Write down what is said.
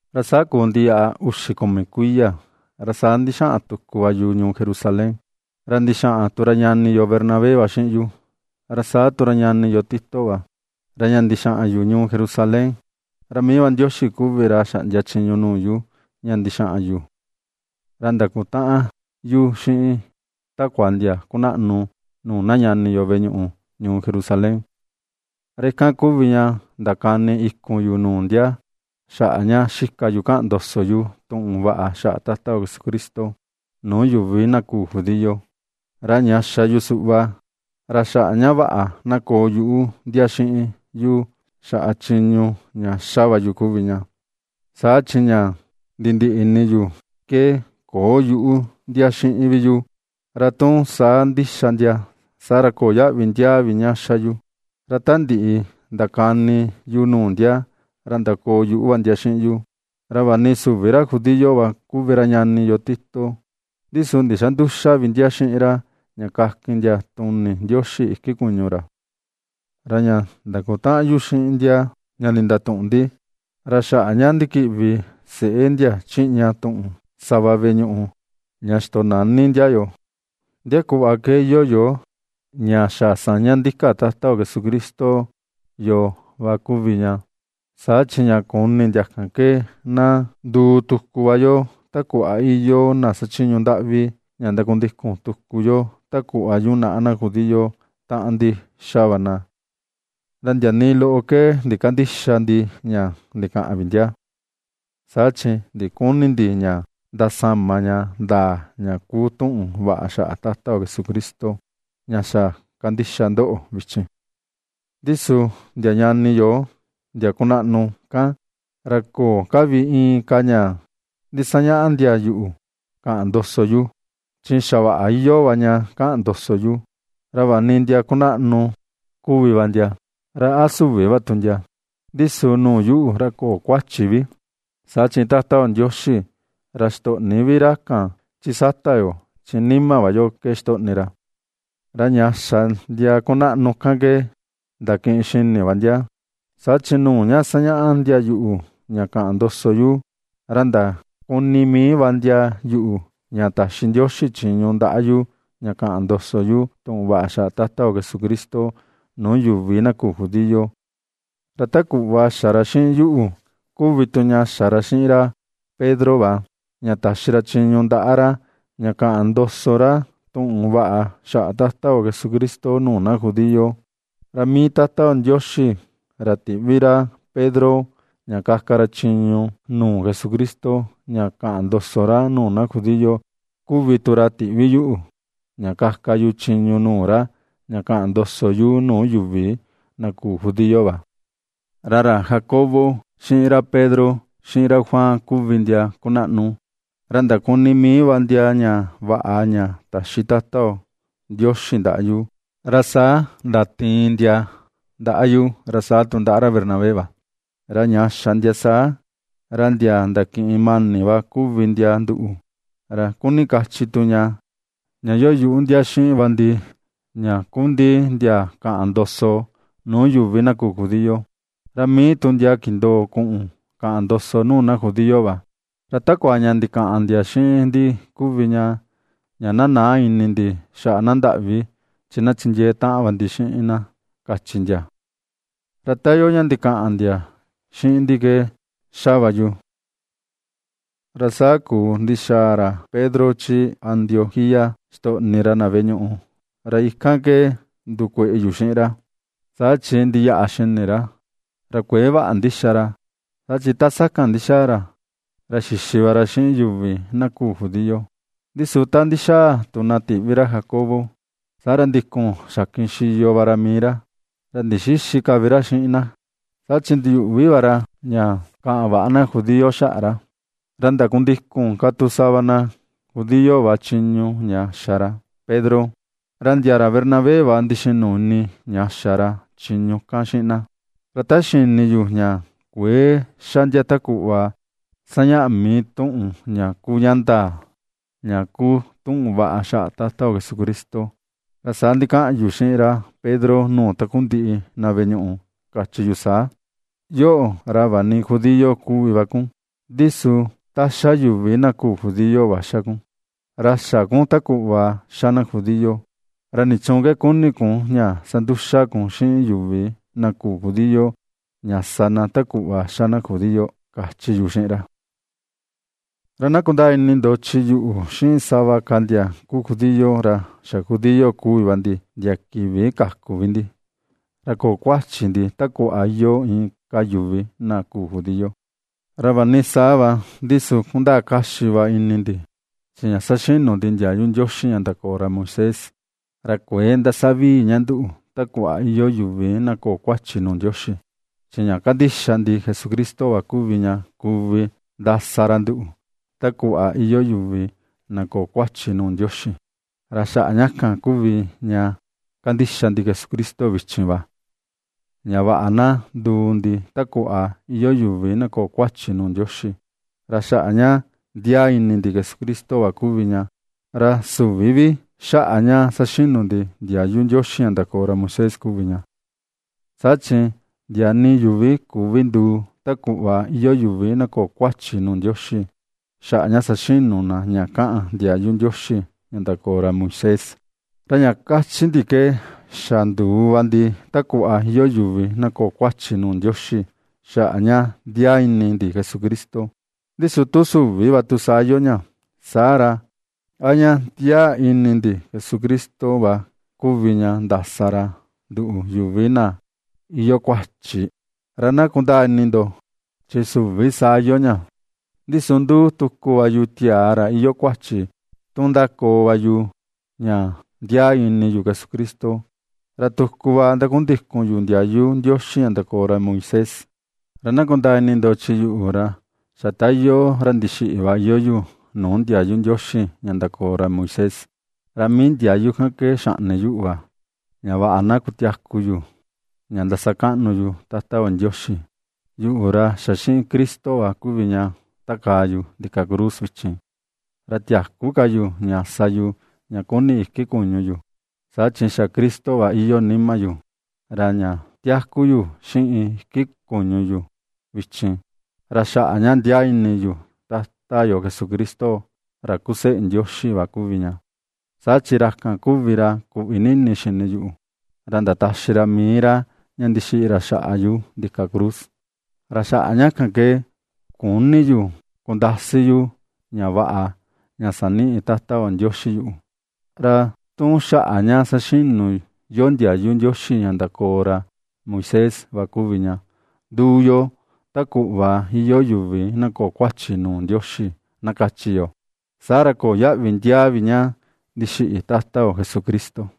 Ra saa kuu ndiyaꞌa uxi kumi kuiya, ra saa ndixaꞌan tuku va yu ñuu Jerusalén, ra ndixaꞌan tu ra ñani yo Bernabé va xiꞌin yu, ra saa tu ra ñani yo Tito va. Ra ña ndixaꞌan yu ñuu Jerusalén, ra mii va Ndioxi kuvi ra xaꞌndia chiñu nuu yu ña ndixaꞌan yu. Ra ndakutaꞌan yu xiꞌin takua ndia kunaꞌnu nuu na ñani yo veꞌe ñuꞌu ñuu Jerusalén. Ra ikan kuvi ña ndakani ikun yu nuu ndia xaꞌa ña xika yu kaꞌan ndoso yu tuꞌun vaꞌa xaꞌa Tata yo Jesucristo, nuu yuvi na küu judío. Ra ña xa yu suꞌva ra xaꞌa ña vaꞌa na koo yuꞌu ndia xiꞌin yu xaꞌa chiñu ña ^xa va yu kuvi ña, saa chi ña nindiꞌi ini yu ke köo yuꞌu ndia xiꞌin vi yu, ra tu saa ndixa ndia, saa ra köo yaꞌvi ndia vi ña ^xa yu. Ra ta ndiꞌi ndakani yu nuu ndia, ra ndakoo yuꞌu va ndia xiꞌin yu, ra vaꞌa ni süvi ra judío va kuvi ra ñani yo Tito, ndi su ndïxa nduxa vi ndia xiꞌin ra ña kakin ndia tuni Ndioxi iki kuñu ra. Ra ña ndakutaꞌan yu xiꞌin ndia ña ndatuꞌun ndi, ra xaꞌa ña ndikiꞌvi seꞌé ndia chiꞌña tuꞌun, sava veꞌe ñuꞌu ña xitonani ndia yoo, ndia kuꞌva ke iyoo yo ña xa saña ndika Tata yo Jesucristo yoo va kuvi ña, saa chi ña kuni ndia kan ke na nduu tuku va yo ta kuꞌva iyoo na xachiñu ndaꞌvi, ña ndakundikun tuku yo ta kuꞌva yunaꞌa na judío taꞌan ndi xa va na. Ra ndia nii loꞌo ke ndikandïxa ndi ña ndikaꞌan vi ndia, saa chi ndiküni ndi ña ndasama ña ndaa ña kuu tuꞌun vaꞌa xaꞌa Tata yo Jesucristo, ña xa kandixa ndoꞌo vichin. Ndi su ndia ñani yo ndia kunaꞌnu kan, ra köo ka vi inka ña ndisañaꞌa ndia yuꞌu kaꞌan ndoso yu, chi xa vaꞌa iyoo va ña kaꞌan ndoso yu. Ra vaꞌa ni ndia kunaꞌnu kuvi va ndia, ra a süvi va tu ndia, ndi su nuu yuꞌu, ra köo kuachi vi, saa chi Tata yo Ndioxi, ra xitöꞌni vi ra kan, chi sata yo, chi nima va yo ke xitoꞌni ra. Ra ña xa ndia kunaꞌnu kan ke ndakiꞌin xini va ndia, saa chi nuu ña ^sañaꞌa ndia yuꞌu ña kaꞌan ndoso yu, ra ndakuni mii va ndia yuꞌu ña taxi Ndioxi chiñu ndaꞌa yu ña kaꞌan ndoso yu tuꞌun vaꞌa xaꞌa Tata yo Jesucristo nuu yuvi na küu judío, ra ta kuꞌva xa ra xiꞌin yuꞌu kuvi tu ña xa ra xiꞌin ra Pedro va, ña taxi ra chiñu ndaꞌa ra ña kaꞌan ndoso ra tuꞌun vaꞌa xaꞌa Tata yo Jesucristo nuu na judío. Ra mii Tata yo Ndioxi, ra tiꞌvi ra Pedro ña kaka ra chiñu nuu Jesucristo ña kaꞌan ndoso ra nuu na judío, kuvi tu ra tiꞌvi yuꞌu, ña kaka yu chiñu nuu ra ña kaꞌan ndoso yu nuu yuvi na küu judío va. Ra ra Jacobo, xiꞌin ra Pedro, xiꞌin ra Juan kuvi ndia kunaꞌnu, ra ndakuni mii va ndia ña vaꞌa ña taxi Tata yo Ndioxi ndaꞌa yu, ra saa ndatiin ndia ndaꞌa yu, ra saa tu ndaꞌa ra Bernabé va. Ra ña xa ndia saa, ra ndia ndakiꞌin mani va kuvi ndia nduꞌu, ra kuni kachi tu ña, ña iyoo yuꞌu ndia xiꞌin va ndi ña kuꞌun ndi ndia kaꞌan ndoso nuu yuvi na küu judío, ra mii tu ndia kindoo kuꞌun kaꞌan ndoso nuu na judío va. Ra takua ña ndikaꞌan ndia xiꞌin ndi kuvi ña, na näa ini ndi xaꞌa na ndaꞌvi chi na chindiee taꞌan va ndi xiꞌin na, kachi ndia. Ra ta iyoo ña ndikaꞌan ndia xiꞌin ndi ke ^xa va yu. Ra saa kuu ndixaa ra Pedro chi Antioquía xitoꞌni ra na veꞌe ñuꞌu, ra ikan ke ndukueꞌe yu xiꞌin ra, saa chi ndiyaꞌa xini ra, ra kuëe vaꞌa ndi xa ra. Saa chi ta sakan ndixaa ra, ra xixi va ra xiꞌin yuvi na küu judío, ndi su ta ndixaa tu na tiꞌvi ra Jacobo; saa ra ndikun xakin xiyo va ra mii ra, ra ndixïxi ka vi ra xiꞌin na, saa chi ndiyuꞌvi va ra ña kaꞌan väꞌa na judío xaꞌa ra. Ra ndakundikun ka tu sava na judío va chiñu ña xa ra Pedro, Ra ndia ra Bernabé va ndixinu ini ña xa ra chiñu kan xiꞌin na. Ra ta xini yu ña kuëe xa ndia ta kuꞌva ^sañaꞌa mii tuꞌun ña kuu ña ndaa, ña kuu tuꞌun vaꞌa xaꞌa Tata yo Jesucristo, ra saa ndikaꞌan yu xiꞌin ra Pedro nuu takundiꞌi na veꞌe ñuꞌu, kachi yu saa: “Yoꞌo, ra vaꞌa ni judío kuvi va kun, ndi su ta ^xa yuvi na küu judío va ^xa kun, ra xä kun ta kuꞌva xa na judío; ¿ra nichuun ke kuni kun ña sanduxa kun xiꞌin yuvi na küu judío, ña ^sa na ta kuꞌva ^xa na judío?”, kachi yu xiꞌin ra. Ra na kundaa ni ndo, chi yuꞌu, xiꞌin sava ka ndia kuu judío, ra xa judío kuvi ndi ndia kivi kaku vi ndi, ra köo kuachi ndi ta kuꞌva iyoo inka yuvi na küu judío. Ra vaꞌa ni saa va, ndi su kundaa kaxi va ini ndi, chi ña saxinu ndi ndiayu Ndioxi ña ndakoo ra Moisés, ra kuëe ndasa vii ña nduꞌu ta kuꞌva iyoo yuvi na köo kuachi nuu Ndioxi, chi ña kandixa ndi Jesucristo va kuvi ña kuvi ndasa ra nduꞌu ta kuꞌva iyoo yuvi na köo kuachi nuu Ndioxi. Ra xaꞌa ña kan kuvi ña kandixa ndi Jesucristo vichin va, ña vaꞌa na nduu ndi ta kuꞌva iyoo yuvi na köo kuachi nuu Ndioxi, ra xaꞌa ña ndiaa ini ndi Jesucristo va kuvi ña, ra süvi vi xaꞌa ña saxinu ndi ndiayu Ndioxi ña ndakoo ra Moisés kuvi ña. Saa chi ndia nii yuvi küvi nduu ta kuꞌva iyoo yuvi na köo kuachi nuu Ndioxi, xaꞌa ña saxinu na ña kaꞌan ndiayu Ndioxi ña ndakoo ra Moisés. Ra ña kachi ndi ke xa nduu va ndi ta kuꞌva iyoo yuvi na köo kuachi nuu Ndioxi xaꞌa ña ndiaa ini ndi Jesucristo, ndi su tu süvi va tu saa iyoo ña, saa ra, ¿a ña ndiaa ini ndi Jesucristo va kuvi ña ndasa ra nduꞌu yuvi na iyoo kuachi?, ra na kundaa ini ndo, ¡chi süvi saa iyoo ña! Ndi su ^nduu tuku va yu tiaa ra iyoo kuachi, tu ^ndakoo va yu ña ndiaa ini yu Jesucristo, ra tuku va ndakundikun yu ndiayu Ndioxi ña ndakoo ra Moisés. Ra na kundaa ini ndo, chi yuꞌu, ra xa ta iyoo ra ndixiꞌi va iyoo yu, nuu ndiayu Ndioxi ña ndakoo ra Moisés; ra mii ndiayu kan ke xaꞌni yuꞌu va, ña vaꞌa na kutiaku yu ña ndasakaꞌnu yu Tata yo Ndioxi. Yuꞌu, ra xa xiꞌin Cristo va kuvi ña takaa yu ndika cruz vichin, ra tiäku ka yu ña sa yu ña kuni iki kuñu yu, saa chi xa Cristo va iyoo nima yu; ra ña tiaku yu xiꞌin iki kuñu yu vichin, ra xaꞌa ña ndiaa ini yu Tata yo Jesucristo ra kuu seꞌe Ndioxi va kuvi ña, saa chi ra kan kuvi ra kuꞌvi ni ini xini yuꞌu, ra ndataxi ra mii ra ña ndixiꞌi ra xaꞌa yu ndika cruz. Ra xaꞌa ña kan ke küni yu kundasi yu ña vaꞌa, ña saniꞌi Tata yo Ndioxi yuꞌu; ra tu xaꞌa ña saxinu yo ndiayu Ndioxi ña ndakoo ra Moisés va kuvi ña, nduu yo ta kuꞌva iyoo yuvi na köo kuachi nuu Ndioxi, na kachi yo, saa ra köo yaꞌvi ndiaa vi ña ndixiꞌi Tata yo Jesucristo.